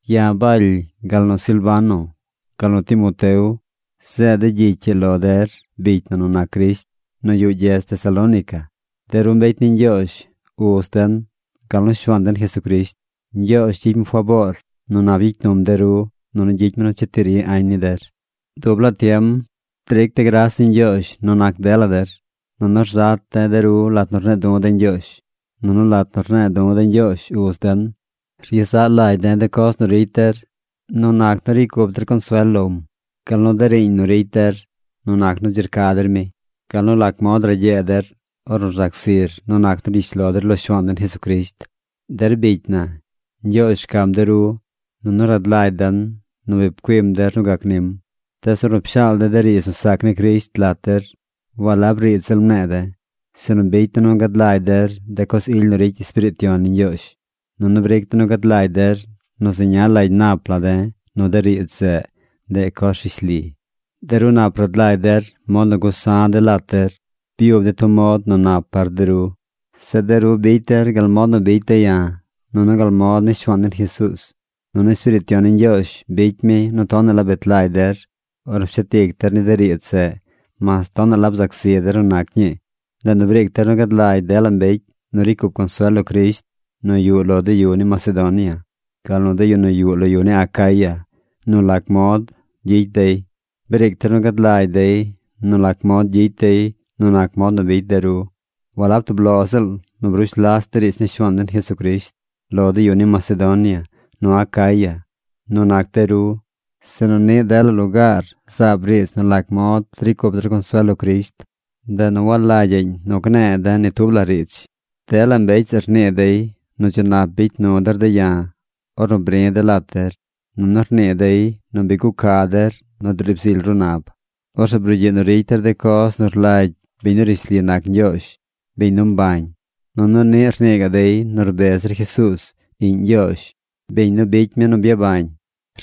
Ya̱ Baly, gal nu Silvano, gal nu Timoteo zeed de̱ gyicy ii lo der bicy na nu nac Crisht nu yuꞌ gyedz Tesalónica, de ru mbecy ni Ñgyoozh, Uz den, gal nu Shuaan den Jesucrisht. Ñgyoozh gyicy mi faboor nu nap gyicy num de ru, nunu gyicy mi nu cheti ri añ ni der. Dub laa tiem dric de̱ gras ni Ñgyoozh nu nac dela der, nunu rzat de̱ de ru lat nu rne̱e̱ du̱ de̱ Ñgyoozh. Nunu lat nu rne̱e̱ du̱ de̱ Ñgyoozh Uz den, ryezaꞌ lagy de̱ de coz nu ricy der nu nac nu ricy cup der consuel lom, gal nu de riiñ nu ricy der nu nac nu dzi rca der mi, gal nu lac mod ragyee der ornu rzac zir nu nac nu rgyish lo der lo Shuaan den Jesucrisht. Der bicy na, Ñgyoozh rcam de ru, nunu rad lagy den nu bi pcuim der nu gac nim. Tees ornu pshaal de̱ de riidz nu sac ni Crisht lat der, walab riidz ziꞌl mne̱e̱ de̱, sinu bicy de̱ nu gad lagy der de coz ily nu ricy Espiriit Yon ni Ñgyoozh, nunu bric de̱ nu gad lagy der nu zeña lagy nap la de̱ nu de riidz zeꞌ, ndeꞌ coz rishli. De ru nap rad lagy der mod nu gusa̱ de̱ lat der. Byub de̱ tub mod nu nap par de ru. Zeꞌ de ru bicy der gal mod nu bicy de̱ ya̱ nunu gal mod ni Shuaan den Jesuuz. Nunu Espiriit Yon ni Ñgyoozh bicy mi nu tonaꞌ la bet lagy der ornu pshet ic der ni de riidz zeꞌ mas tonaꞌ la bzac zi der nu nac ñii. Ndeꞌ nu briic der nu gad lagy dela mbecy nu ricy cup consuel lo Crisht nu yuꞌ lo de yu ni Macedonia, gal nu de yu nu yuꞌ lo yu ni Acaya nu lac mod gyicy dey. Briic der nu gad lagy dey nu lac mod gyicy dey nu nac mod nu bicy de ru. Walab tub lo ziꞌl nu brush las de riidz ni Shuaan den Jesucrisht lo de yu ni Macedonia nu Acaya, nu nac de ru, sinu niꞌ dela lugaar zaab riidz nu lac mod ricy cup der consuel lo Crisht. Ndeꞌ nu walagyaꞌñ nu gne̱e̱ de̱ ni tub la riidz. Dela mbecy zeꞌ rnii dey nu dzi nap bicy nu der de̱ ya̱ ornu bri̱ de̱ lat der. Nunu rnii dey nu bi guca der nu driib zily ru nab. Orzeꞌ brugyiꞌ nu ricy der de coz nu rlagy biñ nu rishli nac Ñgyoozh, biñ nu mbañ. Nunu niꞌ rnii gaꞌ dey nu rbez der Jesuuz, Iꞌñ Ñgyoozh, biñ nu bicy mi nu byabañ.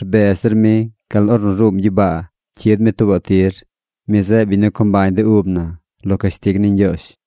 Rbez der mi gal ornu ruum gyibaa cyid mi tuubaꞌ tir. Mi zeꞌ biñ nu co mbañ de ub na lo cashtig ni Ñgyoozh.